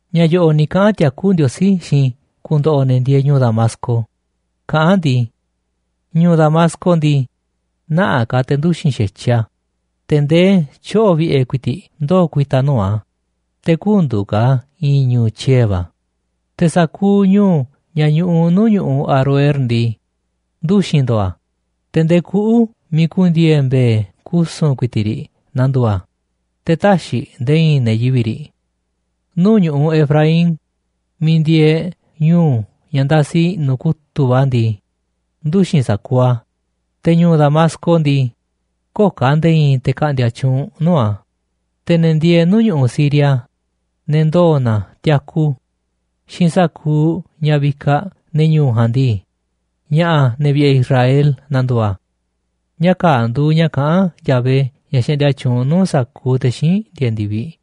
Ña̱ yo̱ꞌo̱ꞌ ni̱ kaꞌa̱n tiakú Ndiosí xiinꞌ i̱ ku̱ndo̱ꞌo̱ ne̱ ndieeꞌ ñu̱u̱ Damasco kaꞌán a̱ ndii: “Ñu̱u̱ Damasco ndii, nä̱ꞌaꞌ ka̱ te̱ nduxi̱n xa̱tyiꞌ a̱, te̱ ndee tyoꞌo̱ vi̱ꞌe̱ ku̱i̱ti̱ꞌ ndoo̱ ku̱i̱ta̱ nuu̱ꞌ a̱, te̱ kü̱ndu̱u̱ ka̱ a̱ i̱i̱n ñu̱u̱ tyiee̱ va̱. Te̱ sa̱kuuꞌ ñu̱u̱ ña̱ ñuꞌuꞌ nuu̱ꞌ ñu̱ꞌuꞌ Aroer ndii, nduxi̱n ndo̱o̱ a̱, te̱ ndee kuꞌu̱ miiꞌ ku̱ndi̱e̱e̱ mbe̱e̱ kusu̱n ku̱i̱ti̱ꞌ riꞌ na̱ndu̱u̱ a̱, te̱ tä̱xiꞌ nde̱e̱ i̱i̱n ne̱ yivi̱ꞌ riꞌ. Nuu̱ꞌ ñu̱ꞌuꞌ Efraín miiꞌ ndieeꞌ ñu̱u̱ ña̱ ndasi i̱ꞌnu̱ kutu̱ꞌ va̱ ndii, nduxi̱n sa̱kuuꞌ a̱. Te̱ ñu̱u̱ Damasco ndii, köo̱ꞌ ka̱ nde̱e̱ i̱i̱n te̱ ka̱ꞌndi̱a̱ tyuunꞌ nuu̱ꞌ a̱, te̱ ne̱ ndieeꞌ nuu̱ꞌ ñu̱ꞌuꞌ Siria, ne̱ ndoo̱ na tiaku xiinꞌ sa̱kuuꞌ ña̱ vikaꞌ ne̱ ñu̱u̱ ja̱a̱nꞌ ndii, ña̱ꞌa̱ ne̱ vi̱ꞌe̱ Israel na̱ndu̱u̱ a̱.” Ña̱ kaa̱ꞌ nduuꞌ ña̱ kaꞌán Yahvé, ña̱ xaꞌndia tyuunꞌ nuu̱ꞌ sa̱kuuꞌ te̱ xíinꞌ ndieeꞌ ndi̱viꞌ.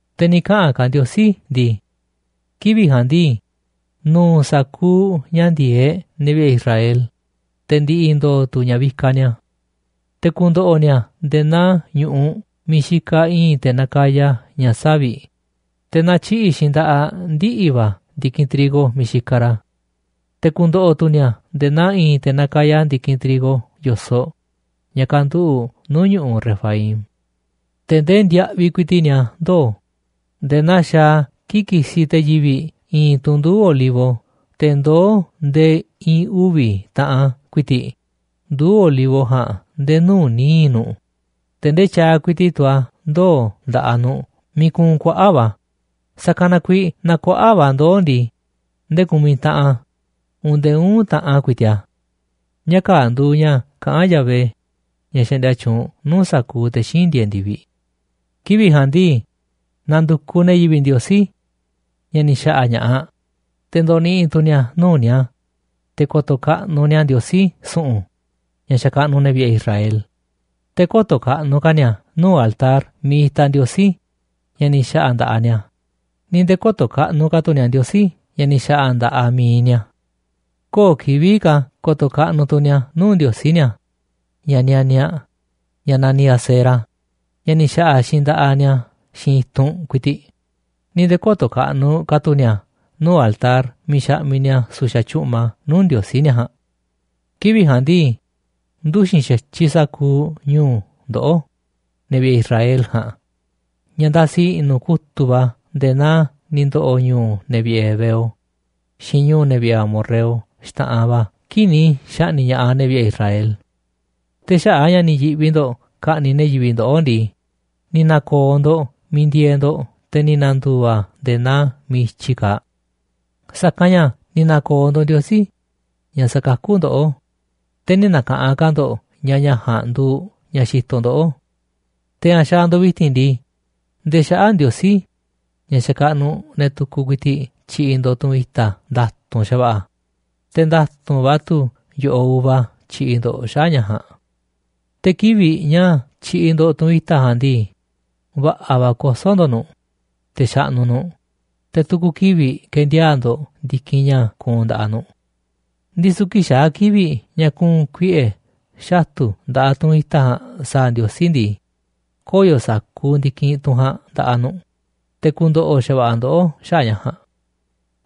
Te̱ ni̱ kaꞌa̱n ka̱ Ndiosí ndii: “Kivi̱ꞌ ja̱a̱nꞌ ndii, nu̱u̱ sa̱kuuꞌ ña̱ ndi̱e̱eꞌ ne̱ vi̱ꞌe̱ Israel, te̱ ndi̱ꞌi̱ ndo̱o̱ tu̱ ña̱ vikaꞌ ni̱a̱. Te̱ ku̱ndo̱ꞌo̱ ni̱a̱ nde̱e̱ naa ñu̱ꞌuꞌ miiꞌ xikaꞌ i̱i̱n te̱ nakaya ña̱ savi̱ꞌ, te̱ natyiꞌi̱ꞌ xiinꞌ nda̱ꞌaꞌ ndiꞌi̱ va̱ ndi̱kinꞌ trigo miiꞌ xikaꞌ ra̱. Te̱ ku̱ndo̱ꞌo̱ tu̱ ni̱a̱ nde̱e̱ naa i̱i̱n te̱ nakaya ndi̱kinꞌ trigo yo̱soꞌ ña̱ kanduꞌu̱ꞌ nuu̱ꞌ ñu̱ꞌuꞌ Refaim. Te̱ ndee ndiaꞌviꞌ ku̱i̱ti̱ꞌ ni̱a̱ ndoo̱ nde̱e̱ naa xaaꞌ a̱ kii̱ꞌ kisiꞌ te̱ yivi̱ꞌ i̱i̱n tunꞌ nduu̱ꞌ olivo te̱ ndoó ndee i̱i̱n uvi̱ taꞌan ku̱i̱ti̱ꞌ nduu̱ꞌ olivo ja̱a̱nꞌ nde̱e̱ nuu̱ꞌ níiꞌ nu̱ꞌ. Te̱ ndee tyaaꞌ ku̱i̱ti̱ꞌ tu̱ a̱ ndoo̱ nda̱ꞌaꞌ nu̱ꞌ miiꞌ kuunꞌ kuaꞌa̱ꞌ va̱ a̱, sa̱kanꞌ na kuiiꞌ naaꞌ kuaꞌa̱ꞌ va̱ ndoo̱ ndii, ndee ku̱miꞌ taꞌan a̱ uun ndee uꞌu̱n taꞌan ku̱i̱ti̱ꞌ a̱.” Ña̱ kaa̱ꞌ nduuꞌ ña̱ kaꞌán Yahvé, ña̱ xaꞌndia tyuunꞌ nuu̱ꞌ sa̱kuuꞌ te̱ xíinꞌ ndieeꞌ ndi̱viꞌ. Kivi̱ꞌ ja̱a̱nꞌ ndii, na̱ndu̱kuꞌ ne̱ yivi̱ꞌ Ndiosí, ña̱ ni̱ xa̱ꞌa̱ ña̱ꞌaꞌ, te̱ ndo̱ni̱ꞌi̱ tu̱ ni̱a̱ nuu̱ꞌ ni̱a̱ te̱ ko̱to̱ kaꞌnuꞌ ni̱a̱ Ndiosí su̱ꞌu̱n, ña̱ xakaꞌnuꞌ ne̱ vi̱ꞌe̱ Israel. Te̱ kö̱to̱ kaꞌnuꞌ ka̱ ni̱a̱ nuu̱ꞌ altar miiꞌ itaꞌ ndiosí ña̱ ni̱ xa̱ꞌa̱ nda̱ꞌaꞌ ni̱a̱, ni̱ nde̱e̱ kö̱to̱ kaꞌnuꞌ ka̱ tu̱ ni̱a̱ ndiosí ña̱ ni̱ xa̱ꞌa̱ nda̱ꞌaꞌ mi̱iꞌ ni̱a̱. Köo̱ꞌ kivi̱ꞌ ka̱ ko̱to̱ kaꞌnuꞌ tu̱ ni̱a̱ nuu̱ꞌ ndiosí ni̱a̱, ña̱ nianiaꞌ, ña̱ naniꞌ Asera, ña̱ ni̱ xa̱ꞌa̱ xiinꞌ nda̱ꞌaꞌ ni̱a̱ xiinꞌ i̱tunꞌ ku̱i̱ti̱ꞌ, ni̱ nde̱e̱ kö̱to̱ kaꞌnuꞌ ka̱ tu̱ ni̱a̱ nuu̱ꞌ altar miiꞌ xaꞌmiꞌ ni̱a̱ su̱xa̱ tyu̱ꞌma nuu̱ꞌ ndiosí ni̱a̱ ja̱a̱nꞌ. Kivi̱ꞌ ja̱a̱nꞌ ndii, nduxi̱n xa̱tyiꞌ sa̱kuuꞌ ñu̱u̱ ndoꞌó, ne̱ vi̱ꞌe̱ Israel ja̱a̱nꞌ, ña̱ ndasi i̱ꞌnu̱ kutu̱ꞌ va̱ nde̱e̱ naa ni̱ ndo̱ꞌo̱ ñu̱u̱ ne̱ vi̱ꞌe̱ heveo xiinꞌ ñu̱u̱ ne̱ vi̱ꞌe̱ amorreo xta̱ꞌanꞌ va̱ kii̱ꞌ ni̱ xa̱ꞌni̱ꞌ ña̱ꞌaꞌ ne̱ vi̱ꞌe̱ Israel. Te̱ xaꞌa̱ꞌ a̱ ña̱ ni̱ yi̱ꞌvi ndo̱ꞌ ka̱ꞌni̱ꞌ ne̱ yivi̱ꞌ ndoꞌó ndii, ni̱ na̱ko̱o̱ ndo̱ꞌ miiꞌ ndieeꞌ ndo̱ꞌ, te̱ ni̱ na̱ndu̱u̱ a̱ nde̱e̱ naa miiꞌ i̱tyi kaaꞌ. Sa̱kanꞌ ña̱ ni̱ na̱ko̱o̱ ndo̱ꞌ Ndiosí, ña̱ sakakú ndoꞌó, te̱ nï̱ na̱ka̱ꞌanꞌ ka̱ ndo̱ꞌ ña̱ ña̱ ja̱a̱nꞌ nduuꞌ ña̱ xitoꞌ ndoꞌó. Te̱ ña̱ xaaꞌ ndo̱ꞌ vi̱ti̱n ndii, ndee xaꞌa̱ꞌ ndiosí, ña̱ xakaꞌnuꞌ ne̱ tukuꞌ, ku̱i̱ti̱ꞌ tyiꞌiꞌ ndo̱ꞌ tunꞌ i̱ta̱ nda̱tu̱nꞌ xa̱va̱ꞌa̱, te̱ nda̱tu̱nꞌ va̱ tu̱ yo̱ꞌoꞌ uva tyiꞌiꞌ ndo̱ꞌ xaꞌa̱ꞌ ña̱ ja̱a̱nꞌ. Te̱ kivi̱ꞌ ña̱ tyiꞌiꞌ ndo̱ꞌ tunꞌ i̱ta̱ ja̱a̱nꞌ ndii, va̱ꞌa̱ va̱ kosó ndo̱ꞌ nu̱ꞌ, te̱ xaꞌnuꞌ nu̱ꞌ, te̱ tu̱ku̱ kivi̱ꞌ kendiaa̱ꞌ ndo̱ꞌ ndi̱kinꞌ ña̱ kuunꞌ nda̱ꞌaꞌ nu̱ꞌ. Ndisu̱ kii̱ꞌ xaa̱ kivi̱ꞌ ña̱ ku̱u̱n kuiꞌe̱ xatu̱ nda̱ꞌaꞌ tunꞌ i̱ta̱ ja̱a̱nꞌ sa̱a̱ Ndiosí ndii, koyo̱ sa̱kuuꞌ ndi̱kinꞌ tunꞌ ja̱a̱nꞌ nda̱ꞌaꞌ nu̱ꞌ, te̱ ku̱ndo̱ꞌo̱ xa̱va̱ꞌa̱ ndoꞌó xaꞌa̱ꞌ ña̱ ja̱a̱nꞌ.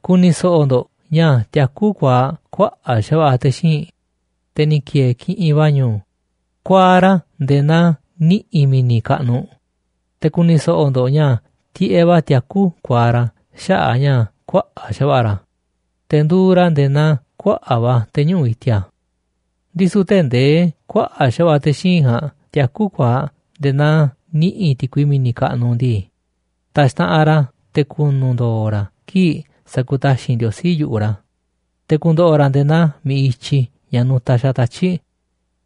Ku̱ni̱ so̱ꞌo̱ ndo̱ꞌ ña̱ tiakú kuaaꞌ kuaꞌa̱ꞌ xa̱va̱ꞌa̱ te̱ xíinꞌ, te̱ ni̱ ki̱e̱e̱ kiꞌinꞌ va̱ ñu̱u̱ kuaaꞌ ra̱ nde̱e̱ naa niꞌi̱ mi̱ni̱ kaꞌnuꞌ, te̱ ku̱ni̱ so̱ꞌo̱ ndo̱ꞌ ña̱ tiꞌeꞌ va̱ tiakú kuaaꞌ ra̱ xaꞌa̱ꞌ ña̱ kuaꞌa̱ꞌ xa̱va̱ꞌa̱ ra̱, te̱ nduuꞌ ra̱ nde̱e̱ naa kuaꞌa̱ꞌ va̱ te̱ñuꞌu̱ꞌ i̱ti̱a̱. Ndisu̱ tee̱ꞌ ndee kuaꞌa̱ꞌ xa̱va̱ꞌa̱ te̱ xíinꞌ ja̱a̱nꞌ tiakú kuaaꞌ nde̱e̱ naa niꞌi̱ ti̱kui mi̱ni̱ kaꞌnuꞌ ndii, ta̱xtaꞌanꞌ ra̱ te̱ ku̱nu̱ ndo̱o̱ ra̱ kii̱ꞌ sa̱ku̱taxi̱nꞌ Ndiosí yu̱ꞌuꞌ ra̱. Te̱ ku̱ndo̱ꞌo̱ ra̱ nde̱e̱ naa mi̱ꞌiꞌ i̱tyi ña̱ nutaꞌ xaaꞌ tatyi̱ꞌ,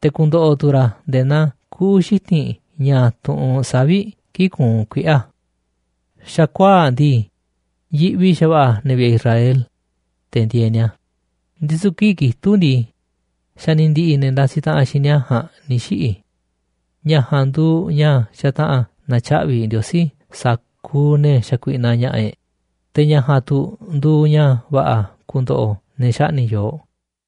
te̱ ku̱ndo̱ꞌo̱ tu̱ ra̱ nde̱e̱ naa kuꞌu̱ xiti̱nꞌ ña̱ tuꞌunꞌ savi̱ꞌ kii̱ꞌ kuunꞌ kuiꞌe̱ a̱. Xa̱kuaa̱ꞌ ndii, yiꞌvi xa̱va̱ꞌa̱ ne̱ vi̱ꞌe̱ Israel, te̱ ndieeꞌ ni̱a̱, ndisu̱ kii̱ꞌ kitúꞌ ndii, xa̱ ni̱ ndi̱ꞌi̱ ne̱ ndasiꞌ taꞌanꞌ xiinꞌ ni̱a̱ ja̱a̱nꞌ ni̱ xiꞌi̱. Ña̱ ja̱a̱nꞌ nduuꞌ ña̱ xataꞌa̱n na̱tyaꞌvi̱ Ndiosí sa̱kuuꞌ ne̱ xakuiꞌnaꞌ ña̱ꞌa̱ e̱ꞌ, te̱ ña̱ ja̱a̱nꞌ tu̱ nduuꞌ ña̱ va̱ꞌa̱ ku̱ndo̱ꞌo̱ ne̱ xaꞌni̱ꞌ yooꞌ.